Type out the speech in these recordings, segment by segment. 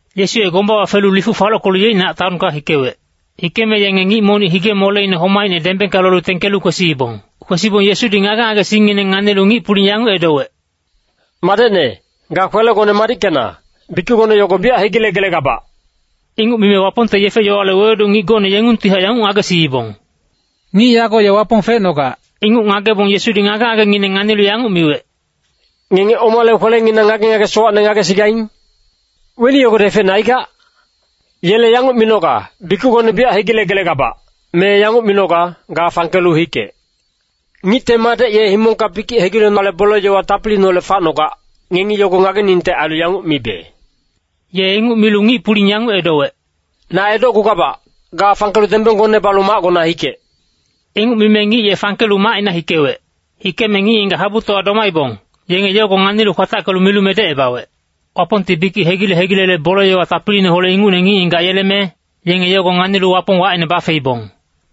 Yesu ye gombawa felu lifuc falockelu yeicnac taonka hikewec. Hikeme yenge ngic monic hige-moleine homaicne dembengka lolu tengkelu kwesiibong. Kwesibong Yesudi ngage-ngagesingngineng nganilu ngic-puling yanguc edowec, “Madecne, ga kwelegone madickena, bikicgone yogo biyac hegilegelegabac.” Inguc mime Wapongte yefe-yowale wewedu ngic gocne yengungtihac yanguc ngagesiibong, “Ngic yago ye Wapong fecnogac!” Inguc ngagebong Yesudi ngage-ngagengineng nganilu yanguc miwec, “Ngenge omale kwelenginang ngage-ngage sowacne ngagesigaing? Weni yogodi efecne aigac? Yele yanguc minoga, ‘Bikicgone biyac hegilegelegabac’ me yanguc minoga, ‘Ga fangkelu hikec.’ Ngicte Madec ye himongka bikic hegilenale bole-yowa tapiliineholec facnogac, ngengi yogo ngageningte ailu yanguc mibe.” Ye inguc milu ngic-puling yanguc edowec,“Na edocgugabac, ga fangkelu dembenggone balu macgona hikec.” Inguc mime ngic ye fangkelu macina hikewec. Hikeme ngic-ngigac habutowa domaibong, yenge yogo nganilu kwatackelu milu medecebawec. Wapongti bikic hegile-hegilele bole-yowa tapiliineholec ingucne ngic-ngigac yeleme, yenge yogo nganilu Wapong wacine bafeibong.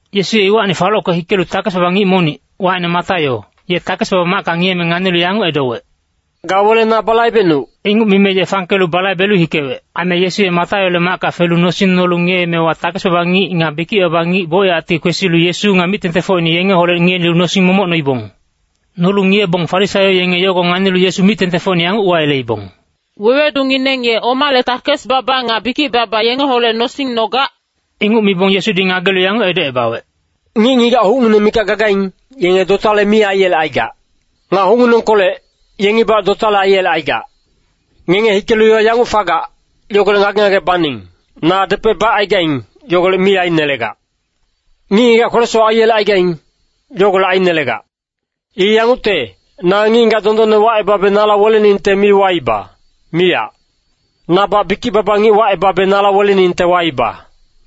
Yesu ye iwacni falocke hikelu takes-baba ngic monic, wacine Mataio, ye takes-baba macka ngiyeme nganilu yanguc edowec, “Ga wele na balaibecnuc!” Inguc mime ye fangkelu balaibelu hikewec. Aime Yesu ye Mataiole macka felu nosing nolu ngiyeemewa takes-baba ngic nga bikic-baba ngic bocyacti kwesilu Yesu nga mic-tengtengfocine yengeholec ngiyelu nosing momoc noibong. Nolu ngiyebong Farisaio yenge yogo nganilu Yesu mic-tengtengfocine yanguc uwayeleibong, “Wewedungineng ye omale takes-baba nga bikic-baba yengeholec nosing nogac?” Inguc mibong Yesudi ngagelu yanguc edocebawec, “Ngic-ngigac hucngineng mikac gagaing, yenge dotale mi aiyelecaigac. Nga hucnginengkolec, yengibac dotale aiyelecaigac. Ngenge hikelu yowa yanguc fagac, yogolec ngage-ngage baning, ‘Na depec bacaigaing, yogolec mi ainelegac. Ngic-ngigac kwele-sowac aiyelecaigaing, yogolec ainelegac.’ I yangucte, na ngic-ngigac dondonne wacebabe nala weleningte mi waiba, miyac. Nabac bikic-baba ngic wacebabe nala weleningte waiba.”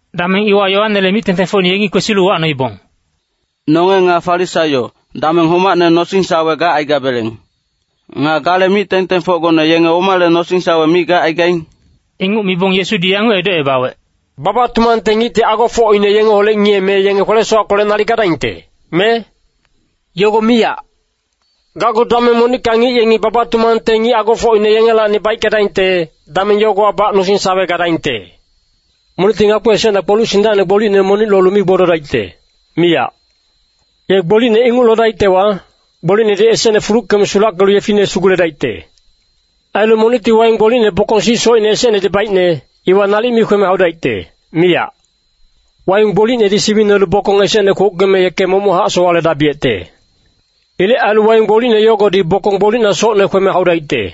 Dameng iwa Yoanele mic-tengtengfocine yengi kwesilu uwacnoibong, “Nonge nga Farisaio, dameng homacne nosing-sawe gacaigabeleng. Nga gale mic-tengtengfocgone yenge omale nosing-sawe mi gacaigaing?” Inguc mibong Yesudi yanguc edocebawec, “Baba-tumangte ngicti agofocine yengeholec ngiyeme yenge kwele-sowackolec nalic gadaingte, me? Yogo miyac. Gacgu dameng monicka ngic yengi baba-tumangte ngic agofocine yengelacni baickedaingte, dameng yogowabac nosing-sawe gadaingte. “Monicti ngakpi esecna kpoluc sindacine gbolicne monic lolu mi gbododaicte, miyac. Ye gbolicne inguc lodaictewa, gbolicnedi esecne fuluckeme sulackelu yefine suguledaicte. Ailu monicti waing gbolicne bokong sic socine esecnedi baicne, iwa nalic mi kweme haudaicte, miyac. Waing gbolicnedi siwinelu bokong esecne kwouckeme yeke momochac sowaledabiyecte. Ilec ailu waing gbolicne yogodi bokong gbolicna socne kweme haudaicte.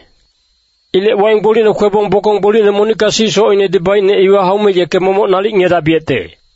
Ilec waing gbolicne kwebong bokong gbolicne monicka sic socinedi baicne iwa haume yeke momoc nalic ngiyedabiyecte.”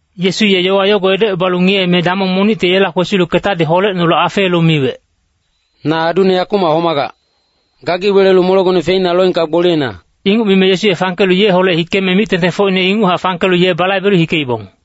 Yesu ye yowa yogo edocebalu ngiyeme damong monicti yela kwesilu ketadi holecnolu afeelu miwec, “Na adune yakumac homagac. Gagi welelu molegone feina loengka gboliyena.” Inguc mime Yesu ye fangkelu yeholec hikeme mic-tengtengfocine inguchac fangkelu ye balaibelu hikeibong.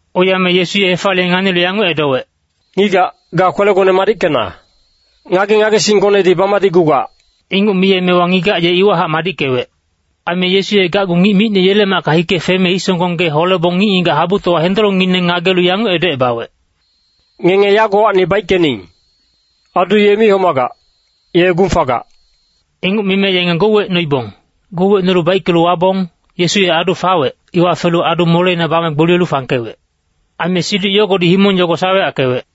Oiyame Yesu ye hefaliye nganilu yanguc edowec, “Ngigac, ga kwelegone madickena. Ngage-ngagesinggonedi bamadicgugac.” Inguc miyemewa ngigac ye iwahac madickewec. Aime Yesu ye gacgu ngic micne yele macka hike feme hisonggong gee holebong ngic-ngigac habutowa hendolongngineng ngagelu yanguc edocebawec, “Ngenge yagowacni baickening. Adu ye mi homagac, ye gung fagac.” Inguc mime yenge gouwecnoibong. Gouwecnolu baickelu wabong, Yesu ye adu fawec, iwa felu adu moleina bame gboliyelu fangkewec. Aime siduc yogodi himong yogo saweyackewec.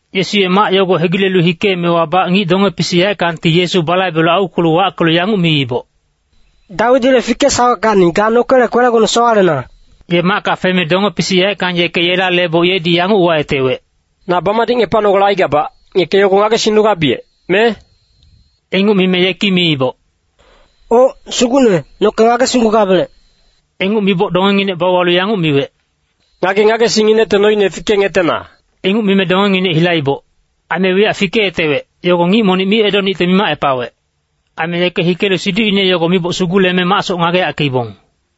Yesu ye mac yogo hegilelu hikeemewabac ngic donge-pisic yaeckangti Yesu balaibelu aukwelu wackelu yanguc miiboc, “Dawidile fikesaweckacni, ga nokele kwelegone sowalena!” Ye macka feme donge-pisic yaeckang yeke yela leboc yedi yanguc uwayetewec, “Na bamadicngepanogale aigabac, ngeke yogo ngagesingnugabiyec, me?” Inguc mime yeki miiboc, “Oc, Sugucne, noke ngagesinggugabelec.” Inguc miboc dongenginec bauwalu yanguc miwec, “Ngage-ngagesingnginecte noine fikengetena.” Inguc mime dongenginec hilaiboc. Aime wiyac fikeyetewec, yogo ngic monic mi edonicte mimacepawec. Aime yeke hikelu siducine yogo miboc suguleme macsoc ngageyackeibong.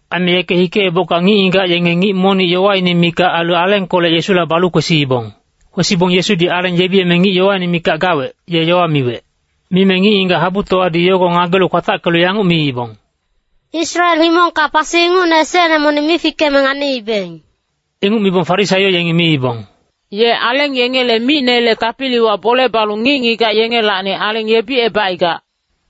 Aime yeke hikeebocka ngic-ngigac yenge ngic monic yowaine mikac ailu alengkolec Yesula balu kwesiibong. Kwesibong Yesudi aleng yebiyeme ngic yowaine mikac gawec, ye yowa miwec. Mime ngic-ngigac habutowadi yogo ngagelu kwatackelu yanguc miibong, “Israel himongka pasi ingucne esecne monic mi fikeme nganiibeng.” Inguc mibong Farisaio yengi miibong, “Ye aleng yengele micnele tapiliwa bole balu ngic-ngigac yengelacni aleng yebicebacaigac.”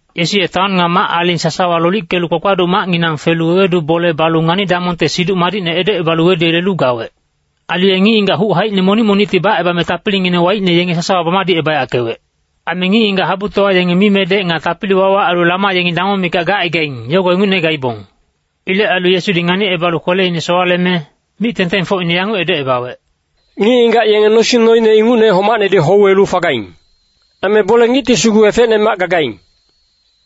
Yesu ye taon nga mac-aling sasawa lolickelu kpakpaduc macnginang felu wewedu bole balu ngani-damongte Siduc Madicne edocebalu weduyelelu gawec. Ailu ye ngic-ngigac huc haicine monic monicti bacebame tapilingineng waicne yenge sasawa bamadicebayackewec. Aime ngic-ngigac habutowa yenge mimedec nga tapili-wawa ailu lama yengi damong mikac gacaigaing, yogo ingucne gaibong. Ilec ailu Yesudi nganicebalu kweleine sowaleme mic-tengtengfocine yanguc edocebawec, “Ngic-ngigac yenge nosing noine ingucne homacnedi houwelu fagaing. Aime bole-ngicti sugu efecnemac gagaing.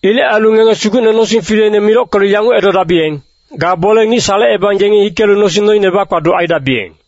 Ilec ailu ngenge Sugucne nosing fileine milockelu yanguc edodabiyeng, ‘Ga bole-ngic salecebang yengi hikelu nosing noine bakpaduc aidabiyeng.’”